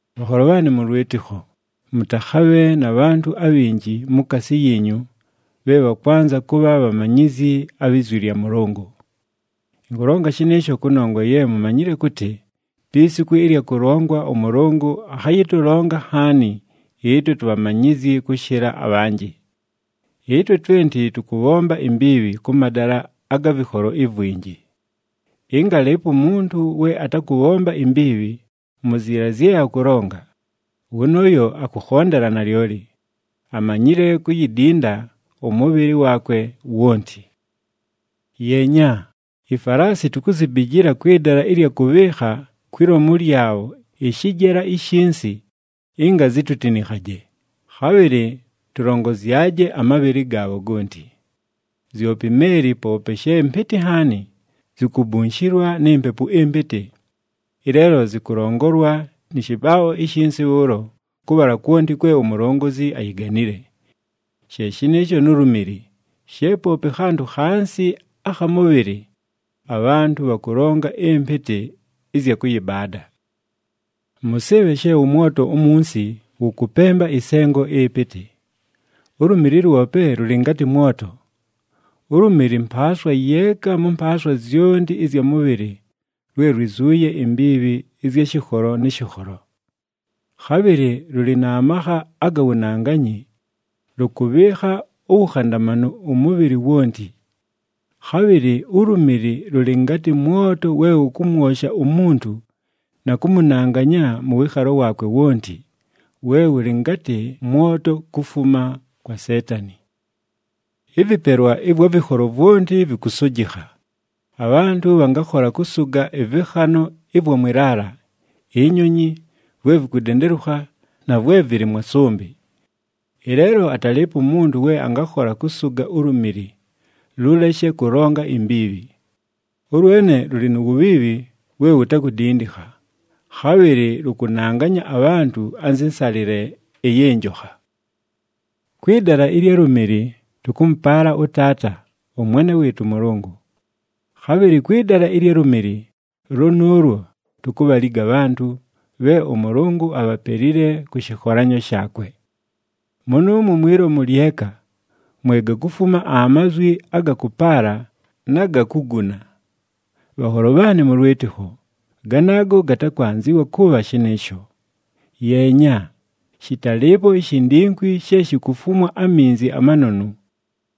Bhanholo bhaanɨ mʉ lwɨtɨkho, mʉtakhabhe na bhantʉ abhinji mukaasi yiinyu bhe bhakwanza kʉbha bhamanyizyi abhi zwi lya Mʉlʉngʉ. Ɨnkʉlonga shɨnɨɨsho kʉnongwa ye mumanyile kʉtɨ, pi siku ɨlya kʉlongwa, ʉMʉlʉngʉ akhayɨtʉlonga nhaani ɨtwe tubhamanyizyi kʉshɨla abhanjɨ. Ɨtwe twenti tʉkʉbhomba imbiibhi kʉ madala aga vɨkholo ivwinji. Ɨnga alɨɨpo umuntu we atakʉbhomba imbiibhi mu ziila zye akʉlonga, wʉnʉʉyo akʉkhondela nalyoli, amanyile kuyidinda ʉmʉbhɨlɨ waakwe wonti. Yeenya, ifalaasi tukuzibijila kwɨ dala ɨlya kʉbhɨɨkha kwi lomu lyabho ɨshɨjela ishinsi, ɨnga zitutinikhaje, khabhɨlɨ tʉlongozyaje amabhɨlɨ gaabho gonti. Zyope imeeli, poope she mpɨtɨ nhaani, zikubunshilwa ni mpepu ɨmpɨtɨ. Ɨleelo zɨkʉlongolwa nɨ shɨbaabho ishinsi bhʉʉlo, kʉbhala kwonti kwe umulongozi ayiganile. She shɨnɨɨsho nu lumili, she poope khantʉ khansi akha mʉbhɨlɨ, abhantʉ bhakʉlonga ɨmpɨtɨ ɨzya kʉyɨbaada. Mʉsɨɨbhe she ʉmwoto umunsi wʉkʉpemba ɨsengo ɨpɨtɨ! Ulumili lwope lʉlɨ ngatɨ mwoto. Ulumili mpaaswa yeeka mʉ mpaaswa zyonti ɨzya mʉbhɨlɨ lwe lwizuuye imbiibhi ɨzya shɨkholo nɨ shɨkholo. Khabhɨlɨ lʉlɨ na makha aga wunanganyi, lʉkʉbhɨɨkha uwukhandamanu ʉmʉbhɨlɨ wonti. Khabhɨlɨ ulumili lʉlɨ ngatɨ mwoto we wʉkʉmwosha umuntu na kʉmʉnanganya mʉ wɨɨkhalo waakwe wonti, we wʉlɨ ngatɨ mwoto kufuma kwa Seetani. Ɨvɨpelwa ɨvwa vɨkholo vwonti vɨkʉsʉjɨkha. Abhantʉ bhangakhola kʉsʉga ɨvɨkhanʉ ɨvwa mwɨ laala, inyonyi, vwe vikudendelukha, na vwe vɨlɨ mwa sʉmbɨ. Ɨleelo atalɨɨpo umuntu we angakhola kʉsʉga ulumili lʉleshe kʉlonga imbiibhi. Ʉlwene lʉlɨ nu wubhiibhi we wutakudindikha, khabhɨlɨ lʉkʉnanganya abhantʉ anzɨ nsalɨle ɨyɨ njokha. Kwɨ dala ɨlya lumili tʉkʉmʉpaala ʉTaata, ʉMwene wɨɨtʉ ʉMʉlʉngʉ. Khabhɨlɨ kwɨ dala ɨlya lumili lʉnʉʉlwo tukubhaliga abhantʉ, bhe ʉMʉlʉngʉ abhapelile kʉ shɨkholanyo shaakwe. Mʉnʉʉmwo mwi lomu lyeka, mwe gakufuma amazwi aga kʉpaala, na ga kuguna. Bhanholo bhaanɨ mʉ lwɨtɨkho, ganaago gatakwanzɨwa kʉbha shɨnɨɨsho! Yeenya, shɨtalɨɨpo ishindingwi she shikufumwa aminzi amanonu,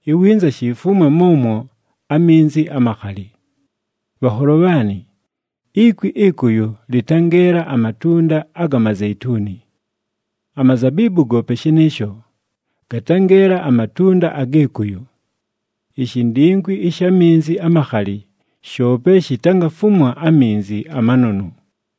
iwinza shifumwe mʉmwo aminzi amakhali! Bhanholo bhaanɨ, ikwi ɨkʉyʉ lɨtangeela amatunda aga mazeituni. Amazabiibu goope shɨnɨɨsho, gatangeela amatunda agɨ kʉyʉ. Ishindingwi ɨsha minzi amakhali shoope shitangafumwa aminzi amanonu.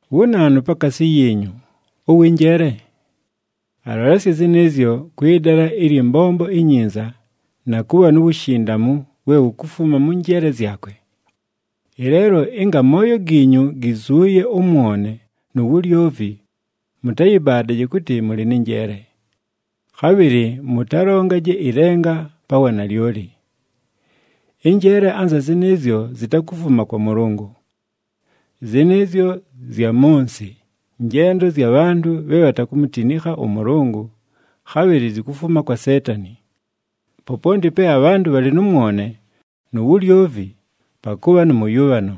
Wu naanu pakaasi yiinyu, ʉwɨ njeele? Alolesye zɨnɨɨzyo kwɨ dala ɨlyɨ mbombo inyinza, na kʉbha nu wushindamu we wukufuma mʉ njeele zyakwe. Ɨleelo ɨnga amooyo giinyu gizuuye ʉmwone nu wulyovi, mʉtayɨbaadaje kʉtɨ mʉlɨ nɨ njeele. Khabhɨlɨ mʉtalongaje ɨlenga pa wanalyoli. Ɨnjeele anza zɨnɨɨzyo zitakufuma kwa Mʉlʉngʉ. Zɨnɨɨzyo zya mʉ nsɨ, njendo zya bhantʉ bhe bhatakumutinikha ʉMʉlʉngʉ, khabhɨlɨ zikufuma kwa Seetani. Poponti pe abhantʉ bhalɨ nʉ mwone nu wulyovi, pakʉbha nʉ mʉyʉbhano,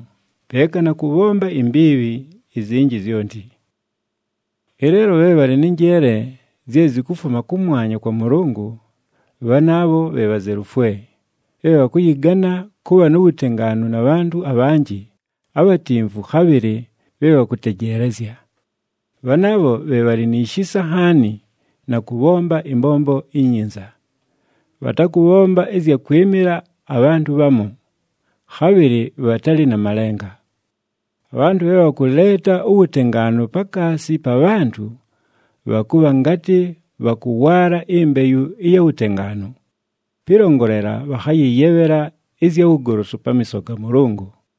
peeka na kʉbhomba imbiibhi izinji zyonti. Ɨleelo, bhe bhalɨ nɨ njeele zye zikufuma kʉmwanya kwa Mʉlʉngʉ, bhanaabho bhe bhazelufwe, bhe bhakʉyɨgana kʉbha nu wutengaanu na bhantʉ abhanjɨ, abhatimvu khabhɨlɨ bhe bhakʉtejeelezya. Bhanaabho bhe bhalɨ ni shisa nhaani, na kʉbhomba ɨmbombo inyinza. Bhatakʉbhomba ɨzya kwɨmɨla abhantʉ bhamu, khabhɨlɨ bhatalɨ na malenga. Abhantʉ bhe bhakʉleeta uwutengaanu pakaasi pa bhantʉ, bhakʉbha ngatɨ bhakʉwaala imbeyu ɨya wutengaanu, pɨlongolela bhakhayɨyebhela ɨzya wugolosu pamiiso ga Mʉlʉngʉ.